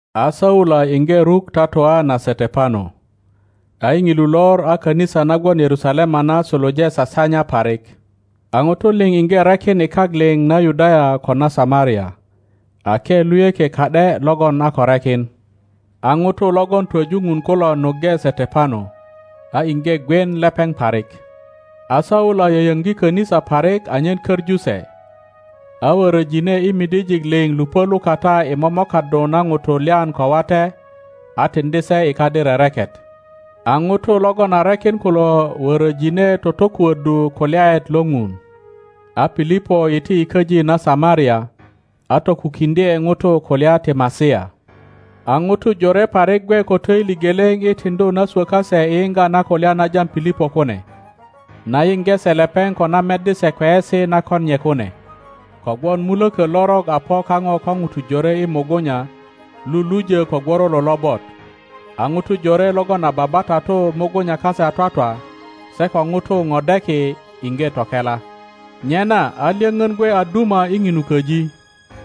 A Saula iŋge ruk tatua na Setepano. Saula a sasaŋdu kayupok A i Ŋilu lor a kanisa na gwon Yerusalema na suluje sasanya parik; a ŋutu liŋ iŋge rekin i kak liŋ na Yudaya ko na Samaria, ake luyökie ka ’de logon a ko rekin. a ŋutu logon twoju Ŋun kulo nuŋge Setepano, a iŋge gwien lepeŋ parik. A Saula yoyoŋgi kanisa parik anyen koŋu se; a wöröjine i midijiik liŋ lupö lukata i momokaddu na ŋutu lyan ko wate, a tiŋdi se i kadi rereket. A ŋutu logon a rekin kulo wöröjine totokuöddu kulyaet lo Ŋun. A Pilipo iti i köji na Samaria, a tokukiŋdye ŋutu kulya ti Masia. A ŋutu Jore parik gwe ko töili geleŋ i tiŋdu na swö kase i yiŋga na kulya na jam Pilipo kune, na yiŋge se lepeŋ ko na meddi se kweyesi na kon nye kune. Kogwon mulökö lorok a po kaŋo ko Ŋutu jore i mugunya lulujö ko gworolo lobot, a ŋutu jore logon a babatatu mugunya kase a twatwa, se ko ŋutu podeki iŋge tokela. Nyena a lyöŋön gwe a duma i ŋinu köji.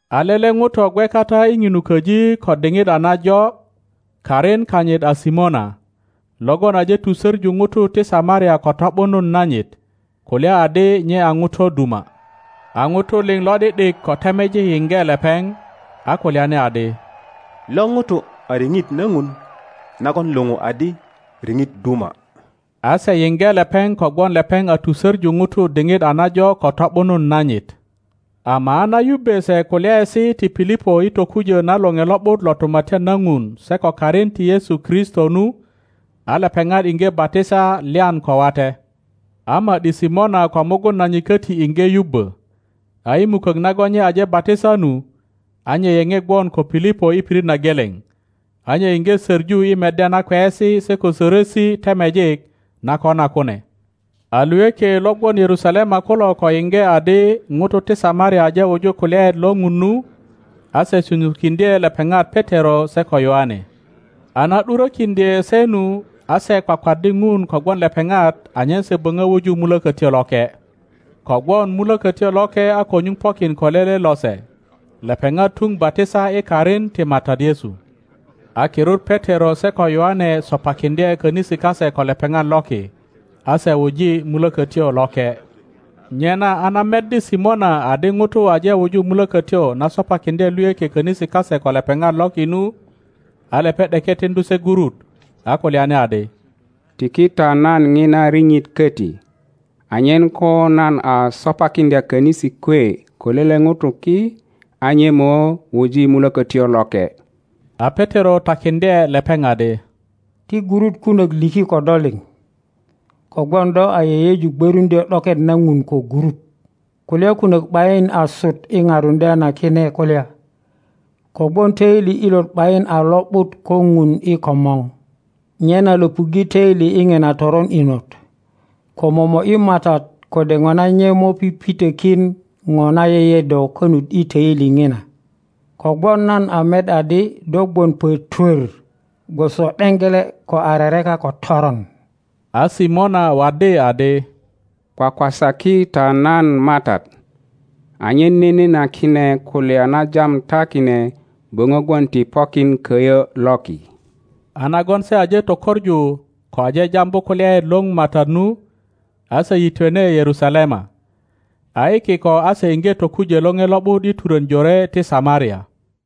A lele ŋuto gwe kata i ŋinu köji ko diŋit a najo, karin kanyit a Simona, logon aje tusöŋu ŋutu ti Samaria ko to ’bunun nanyit, kulya adi nye a ŋuto duma. A ŋutu liŋ lo ’di ’dik ko temejik yiŋge lepeŋ, a kulyani adi, Lo ŋuto a riŋit na Ŋun nagon luŋu adi Riŋit Duma. A se yiŋge leperi kogwon lepeŋ a tusöŋu ŋutu diŋit a najo ko to ’bunun nanyit. Ama a na yubbe se kulyaesi ti Pilipo i tokujö na Loŋe Lo ’but lo Tumatyan na Ŋun se ko karin ti Yesu Kristo nu, a lepeŋat iŋge batisa lyan ko wate. a ma ’di Simona ko mugun nanyit köti iŋge yubbö, a i mukök nagon nye aje batisa nu, a nye yeŋe gwon ko Pilipo i pirit na geleŋ, a nye iŋge soŋu i meddya na kweyesi se ko sörösi temejik na kona kune. A luyökie lo gwon Yerusalema kulo ko yiŋge adi ŋutu ti Samaria aje wuju kulyaet lo Ŋun nu, a se sunyukiŋdye lepeŋat Petero se ko Yoane. A na ’durökiŋdye se nu, a se kwakwaddi Ŋun kogwon lepeŋat anyen se böŋö wuju Mulökötyo Loke. Kogwon Mulökötyo Loke a ko nyuŋ pokin ko lele lose, lepeŋat tuŋ batisa i karin ti Matat Yesu. a kirut Petero se ko Yoane sopakiŋdye könisi kase ko lepeŋat loki, a se wuji Mulökötyo Loke. Nyena a na meddi Simona adi ŋutu aje wuju Mulökötyo na sopakiŋdye luyökie könisi kase ko lepeŋat loki nu, a lepeŋ ’deke tiŋdu se gurut, a kulyani adi, Tiki ta nan ŋina riŋit köti, anyen ko nan a sopakiŋdya könisi kwe ko lele ŋuto ki, a nye mo wuji Mulökötyo Loke. A Petero takiŋdye lepeŋ adi, Ti gurut kunök liki ko do liŋ, kogwon do a yeyeju gwöruŋdyö ’doket na Ŋun ko gurut! Kulya kunök ’bayin asut i parundya na kine kulya, kogwon töili ilot ’bayin a lo ’but ko Ŋun i komor. Nyena löpuŋge töili i ŋina toron inot, ko momo ’yi Matat kode ŋona nye mo pipitökin ŋo na yeye do konut i töili ŋina. Kogwon nan a met adi do gwon pötwör gwoso ’deŋgele ko a rereka ko toron. a Simona waddi adi, Kwakwasaki ta nan Matat, anyen nene na kine kulya na jam ta kine böŋö gwon ti pokin köyö loki. A nagon se aje tökoŋu ko aje jambu kulyaet lo Matat nu, a se yitwene Yerusalema, a i kiko a se iŋge tokujö Loŋe Lo ’but i turön jore ti Samaria.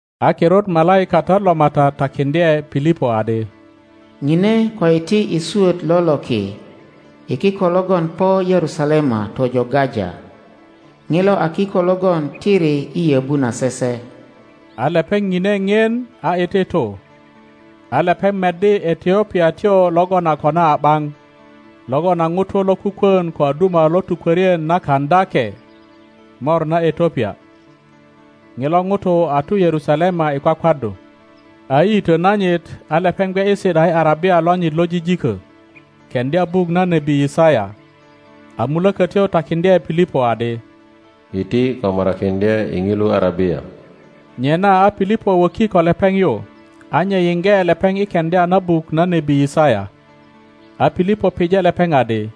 A kirut malaikatat lo Matat takiŋdye Pilipo adi, Ŋine ko iti i swöt lo loki i kiko logon po Yerusalema tojo Gaja. (Ŋilo a kiko logon tiri i yöbu na sese.) a lepeŋ ŋine ŋien a iti tu, a lepeŋ meddi Etiopiatyo logon a kona a ’baŋ, logon a ŋuto lokukwön ko a duma lo tukwörien na Kaŋöake mor na Etiopia. Ŋilo ŋuto a tu Yerusalema i kwakwaddu; a i yitö nanyit, a lepeŋ gwe i si ’da i arabia lonyit lo jijiko, keŋdya buk na nebi Yisaya. A Mulökötyo takiŋdye Pilipo adi, Iti ko morakiŋdye i ŋilu arabia. Nyena a Pilipo wöki ko lepeŋ yu, a nye yiŋge lepeŋ i keŋdya na buk na nebi Yisaya. A Pilipo pije lepeŋ adi,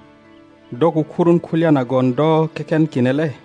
Do kukurun kulya nagon do keken kine le?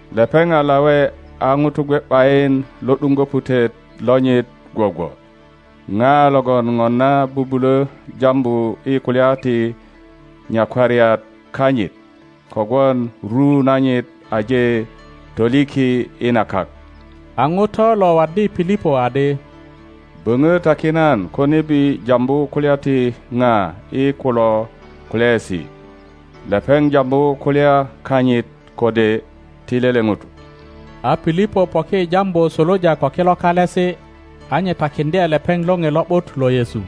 Lepeŋ a lawe a ŋuto gwe ’bayin lo ’duŋgo putet lonyit gwogwo ŋa logon ŋona bubulö jambu i kulya ti nyakwariat kanyit? Kogwon ru nanyit aje toliki i na kak. A ŋuto lo waddi Pilipo adi, Böŋö taki nan ko nebi jambu kulya ti pa i kilo kalesi, lepeŋ jambu kulya kanyit kode ti lele ŋuto? a Pilipo poki i jambu suluja ko kilo kalesi, a nye takiŋdye lepeŋ Loŋe Lo ’but lo Yesu.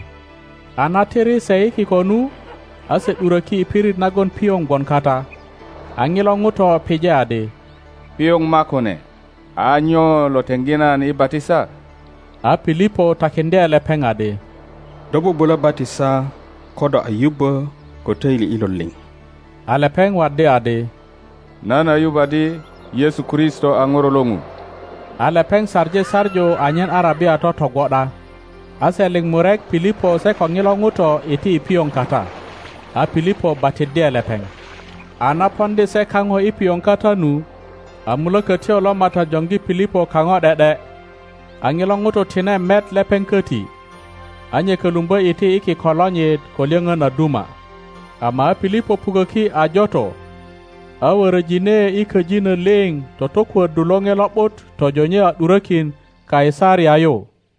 A na tiri se i kiko nu, a se ’duröki i pirit nagon pioŋ gwon kata, a ŋilo ŋuto pije adi, Pioŋ makune! A nyo lo teŋgi nan i batisa? [ A Pilipo takiŋdye lepeŋ adi, Do bubulö batisa ko do a yubbo ko töili ilot liŋ. A lepeŋ waddi adi, Nan a yuŋ adi Yesu Kristo a ŋuro lo Ŋun.] A lepeŋ saŋi saŋu anyen arabia totogwo ’da, a se liŋ murek Pilipo se ko ŋilo ŋuto iti i pioŋ kata, a Pilipo batiddye lepeŋ. a na poŋdi se kaŋo i pioŋ kata nu, a Mulokotyo lo Matat joŋgi Pilipo kaŋo ’de ’de, a ŋilo ŋuto tine met lepeŋ köti; a nye kölumbö iti i kiko lonyit ko lyöpön a duma. Ama a Pilipo puköki A joto, a wöröjine i köjino liŋ totokuöddu Loŋe Lo ’but tojo nye a ’durökin Kaisaria yu.